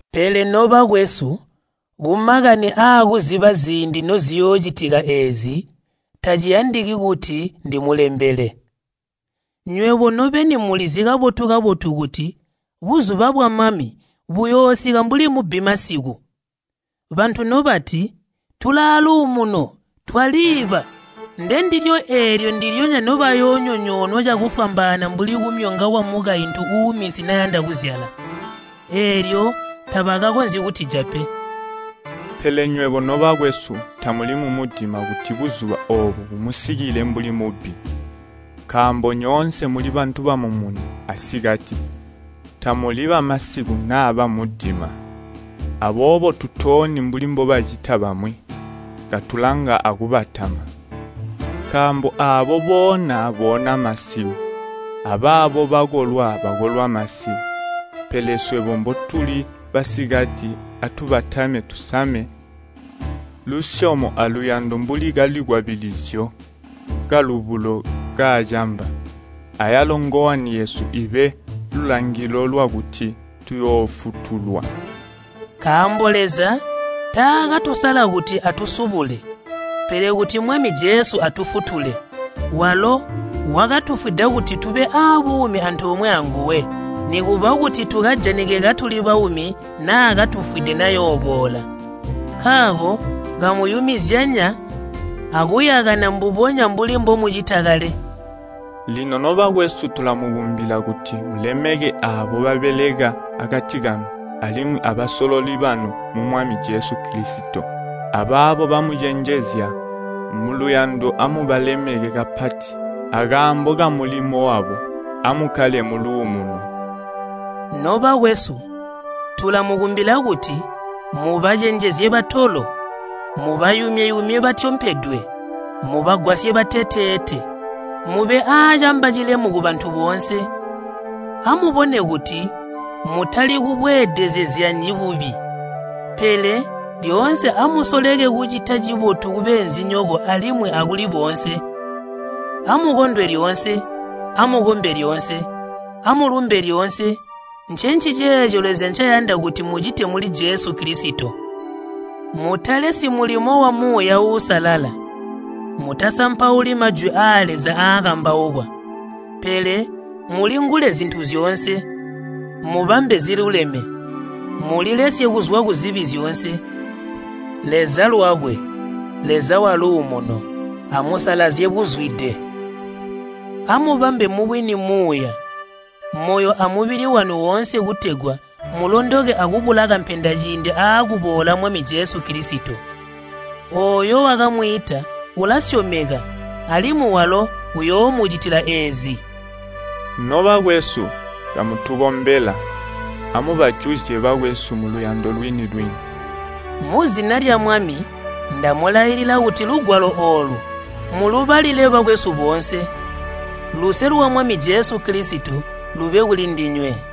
Pele, nobakwesu, kumakani aakuziba ziindi noziyoocitika eezi, taciyandiki kuti ndimulembele. Nywebo nobeni mulizi kabotu-kabotu kuti buzuba bwa Mwami buyoosika mbuli mubbi masiku. Bantu nobati, “Tulaaluumuno, twaliiba.” Ndendilyo eelyo ndilyonya nobayoonyonyoonwa cakufwambaana mbuli kumyongwa kwamukaintu uuminsi nayanda kuzyala. Eelyo tabakakonzyi kutija pe. Pele nywebo, nobakwesu, tamuli mumudima kuti buzuba oobo bumusikile mbuli mubbi. Nkaambo nyoonse muli bantu bamumuni asikati. Tamuli bamasiku naa bamudima. Aboobo tutooni mbuli mbobacita bamwi. Katulanga akubatama. Nkaambo aabo boona boona masiku, abaabo bakolwi bakolwa masiku. Pele swebo mbotuli basikati atubatame tusame lusyomo aluyando mbuli kalikwabilizyo kalubulo kaacamba. Ayalo ngowani yesu ibe lulangilo lwakuti tuyoofutulwa. Nkaambo Leza taakatusala kuti atusubule, pele kuti Mwami Jesu atufutule. Walo wakatufwida kuti tube aabuumi antoomwe anguwe, nikuba kuti tukajanike katuli baumi naa katufwide nayooboola. Nkaako kamuyumizyanya akuyakana mbubonya mbuli mbomucita kale. Lino nobakwesu tulamukumbila kuti mulemeke aabo babeleka akati kanu alimwi abasololi banu mu Mwami Jesu Kilisito, abaabo bamucenjezya. Muluyando amubalemeke kapati akaambo kamulimo wabo. Amukkale muluumuno. Nobakwesu, tulamukumbila kuti mubacenjezye batolo, mubayumye-yumye batyompedwe, mubagwasye bateteete, mube aacamba cilemu kubantu boonse. Amubone kuti mutali kubweedezezyanyi bubi, pele lyoonse amusoleke kucita cibotu kubeenzinyoko alimwi akuli boonse. Amukondwe lyoonse. Amukombe lyoonse. Amulumbe lyoonse, ncenciceeco Leza ncayanda kuti mucite muli Jesu Kilisito. Mutalesyi mulimo wa Muuya Uusalala. Mutasampauli Majwi aa Leza aakambaukwa. Pele mulingule zintu zyoonse. Mubambe ziluleme. Mulilesye kuzwa kuzibi zyoonse. Leza lwakwe, Leza wa luumuno, amusalazye buzude. Amubambe mubwini muuya, moyo amubili wanu woonse kutegwa mulondoke akubula kampenda ciindi aakuboola Mwami Jesu Kilisito. Ooyo wakamwiita ulasyomeka, alimwi walo uyoomucitila eezi. Nobakwesu, kamutukombela. Amubajuzye bakwesu muluyando lwini-lwini. Muzina lya Mwami ndamulailila kuti lugwalo oolu mulubalile bakwesu boonse. Luse lwa Mwami Jesu Kilisito lube kulindinywe.